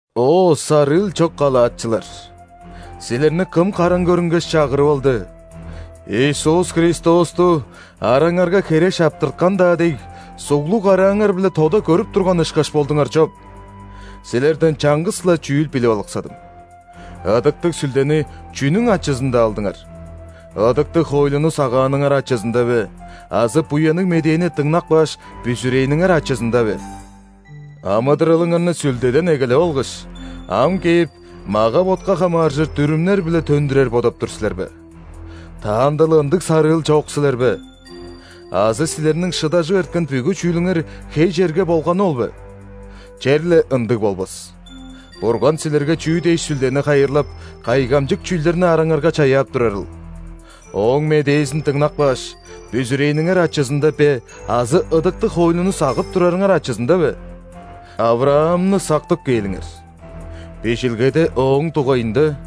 О, сарыыл чок галатчылар! Силерни кым караң көрүнгеш, чагырып алды?! Иисус Христосту, араңарга хере шаптырткан-даа дег, суглуг карааңар-биле тода көрүп турган ышкаш болдуңар чоп! Силерден чаңгыс-ла чүүл билип алыксадым. Ыдыктыг Сүлдени чүнүң ачызында алдыңар: ыдыктыг хоойлуну сагааныңар ачызында бе азы Буянныг Медээни дыңнап кааш, бүзүрээниңер ачызында бе? Амыдыралыңарны Сүлдеден эгелеп алгаш, ам кээп, мага-ботка хамааржыр дүрүмнер-биле төндүрер бодап тур силер бе? Таанда-ла ындыг сарыыл чок силер бе?! Азы силерниң шыдажып эрткен бүгү чүүлүңер хей черге болганы ол бе? Черле ындыг болбас! Бурган силерге чүү дээш Сүлдени хайырлап, кайгамчык чүүлдерни араңарга чаяап турарыл: Ооң медээзин дыңнап кааш, бүзүрээниңер ачызында бе азы ыдыктыг хоойлуну сагып турарыңар ачызында бе? ·Авраамны сактып кээлиңер. Бижилгеде ооң дугайында: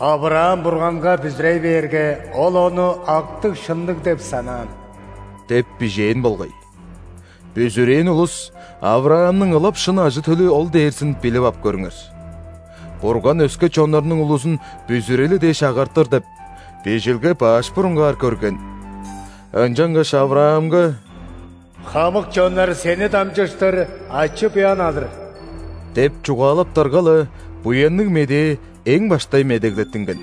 «Авраам Бурганга бүзүрей бээрге, Ол ону актыг-шынныг деп санаан» – деп бижээн болгай. Бүзүрээн улус – Авраамның ылап шын ажы-төлү ол дээрзин билип ап көрүңер. Бурган өске чоннарның улузун бүзүрели дээш агартыр деп, Бижилге баш бурунгаар көрген, ынчангаш Авраамга: «Хамык чоннар сени дамчыштыр ачы-буян алыр» – деп чугаалаптарга-ла, Буянныг Медээ эң баштай медеглеттинген.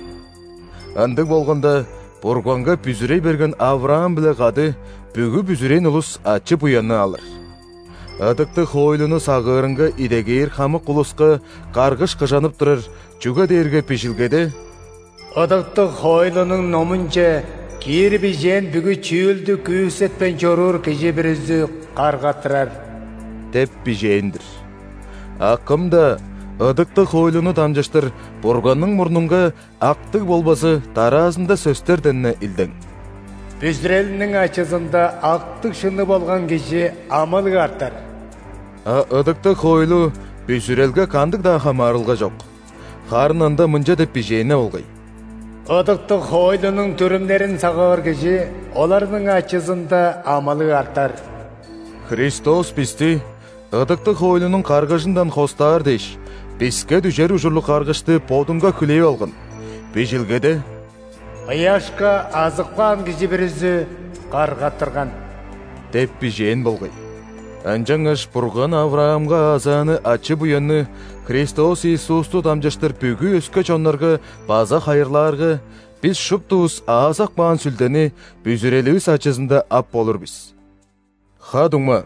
Ындыг болганда, Бурганга бүзүрей берген Авраам-биле кады бүгү бүзүрээн улус ачы-буянны алыр. Ыдыктыг хоойлуну сагыырынга идегээр хамык улуска каргыш кыжанып турар, чүге дээрге Бижилгеде:«Ыдыктыг хоойлунуң номунче киир бижээн бүгү чүүлдүкүүсетпейн чоруур кижи бүрүзү каргаттырар» деп бижээн-дир. А кым-даа ыдыктыг хоойлуну дамчыштыр Бурганның мурнунга актыг болбазы дараазында сөстерден-не илдең:«Бүзүрелиниң ачызында актыг-шынныг болган кижи амылыг артар». А ыдыктыг хоойлу бүзүрелге кандыг-даа хамаарылга чок, харын ында мынча деп бижээн-не болгай:«Ыдыктыг хоойлунуң дүрүмнерин сагыыр кижиоларның ачызында амылыг артар». Христос бисти ыдыктыг хоойлунуң каргыжындан хостаар дээш, биске дүжер ужурлуг каргышты Бодунга хүлээп алган – Бижилгеде: «Ыяшка азып каан кижи бүрүзү – каргаттырган» деп бижээн болгай. Ынчангаш Бурган Авраамга аазааны ачы-буянны Христос Иисусту дамчыштыр бүгү өске чоннарга база хайырлаарга, бис шуптувус аазап каан Сүлдени бүзүреливис ачызында ап болур бис. Ха-дуңма,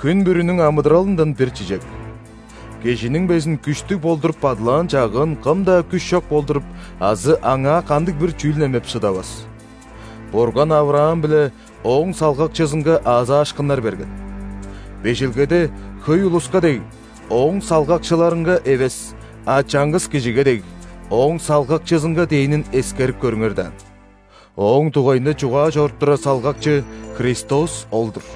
хүн бүрүнүң амыдыралындан бир чижек: кижиниң безин күштүг болдуруп бадылаан чагыын кым-даа күш чок болдуруп азы аңаа кандыг-бир чүүл немеп шыдавас. Бурган Авраам биле ооң салгакчызынга аазаашкыннар берген. Бижилгеде, хөй улуска дег, «Ооң салгакчыларынга» эвес, а чаңгыс кижиге дег, «Ооң салгакчызынга» дээнин эскерип көрүңер даан, ооң дугайында чугаа чоруп турар салгакчы – Христос ол-дур.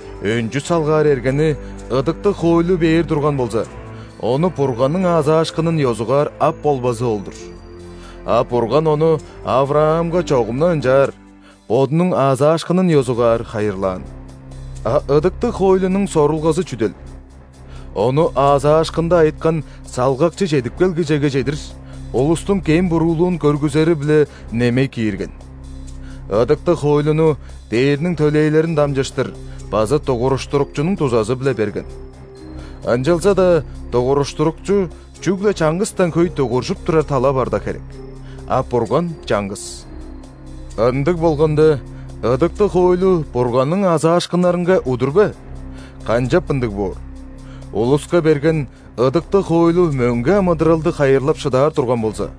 Өнчү салгаар эргени ыдыктыг хоойлу бээр турган болза, ону Бурганның аазаашкынын ёзугаар ап болбазы ол-дур. А Бурган ону Авраамга чогум-на ынчаар – Бодунуң аазаашкынын ёзугаар хайырлаан. А ыдыктыг хоойлунуң сорулгазы чүдел? Ону аазаашкында айыткан Салгакчы чедип келгижеге чедир, улустуң кем-буруулуун көргүзери-биле немей киирген. Ыдыктыг хоойлуну ·дээрниң төлээлерин дамчыштыр база дугуруштурукчунуң дузазы-биле берген. Ынчалза-даа дугуруштурукчу чүгле чаңгыстан хөй дугуржуп турар тала барда херек. А Бурган чаңгыс! Ындыг болганда, ыдыктыг хоойлу Бурганның аазаашкыннарынга удур бе? Канчап ындыг боор! Улуска берген ыдыктыг хоойлу мөңге амыдыралды хайырлап шыдаар турган болза,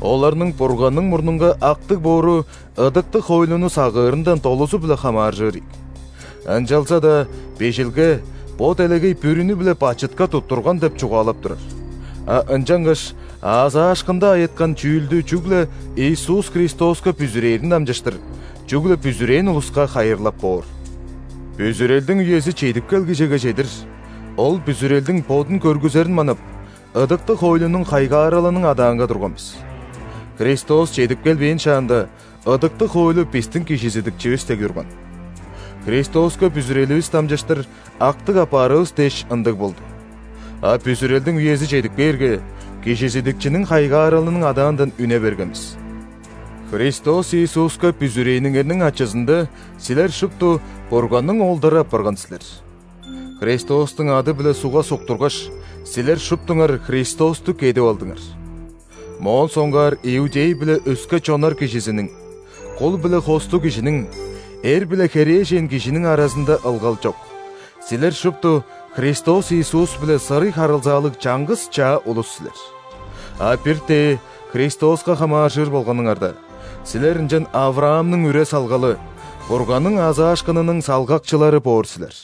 оларның Бурганның мурнунга актыг боору ыдыктыг хоойлуну сагыырындан долузу-биле хамааржыр ийик. Ынчалза-даа Бижилге бо делегей бүрүнү-биле бачытка туттурган деп чугаалап турар, а ынчангаш аазаашкында айыткан чүүлдү чүгле Иисус Христоска бүзүрээрин дамчыштыр, чүгле бүзүрээн улуска хайырлап боор. Бүзүрелдиң үези чедип келгижеге чедир, ол бүзүрелдиң бодун көргүзерин манап, ыдыктыг хоойлунуң хайгааралының адаанга турган бис. Христос чедип келбээн шаанда, ыдыктыг хоойлу бистиң кижизидикчивис дег турган. Христоска бүзүреливис дамчыштыр актыг апаарывыс дээш ындыг болду. А бүзүрелдиң үези чедип кээрге, кижизидикчиниң хайгааралының адаандан үне берген бис. Христос Иисуска бүзүрээниңерниң ачызында силер шупту Бурганның оолдары апарган силер. Христостуң ады-биле ·сугга суктургаш, силер шуптуңар Христосту «кедип алдыңар». Моон соңгаар иудей биле өске чоннар кижизиниң, кул биле хостуг кижиниң, эр биле херээжен кижиниң аразында ылгал чок – силер шупту Христос Иисус-биле сырый харылзаалыг чаңгыс чаа улус силер. А бир-тээ Христоска хамааржыр болганыңарда, силер ынчан ·Авраамның үре-салгалы, Бурганның аазаашкынының салгакчылары боор силер.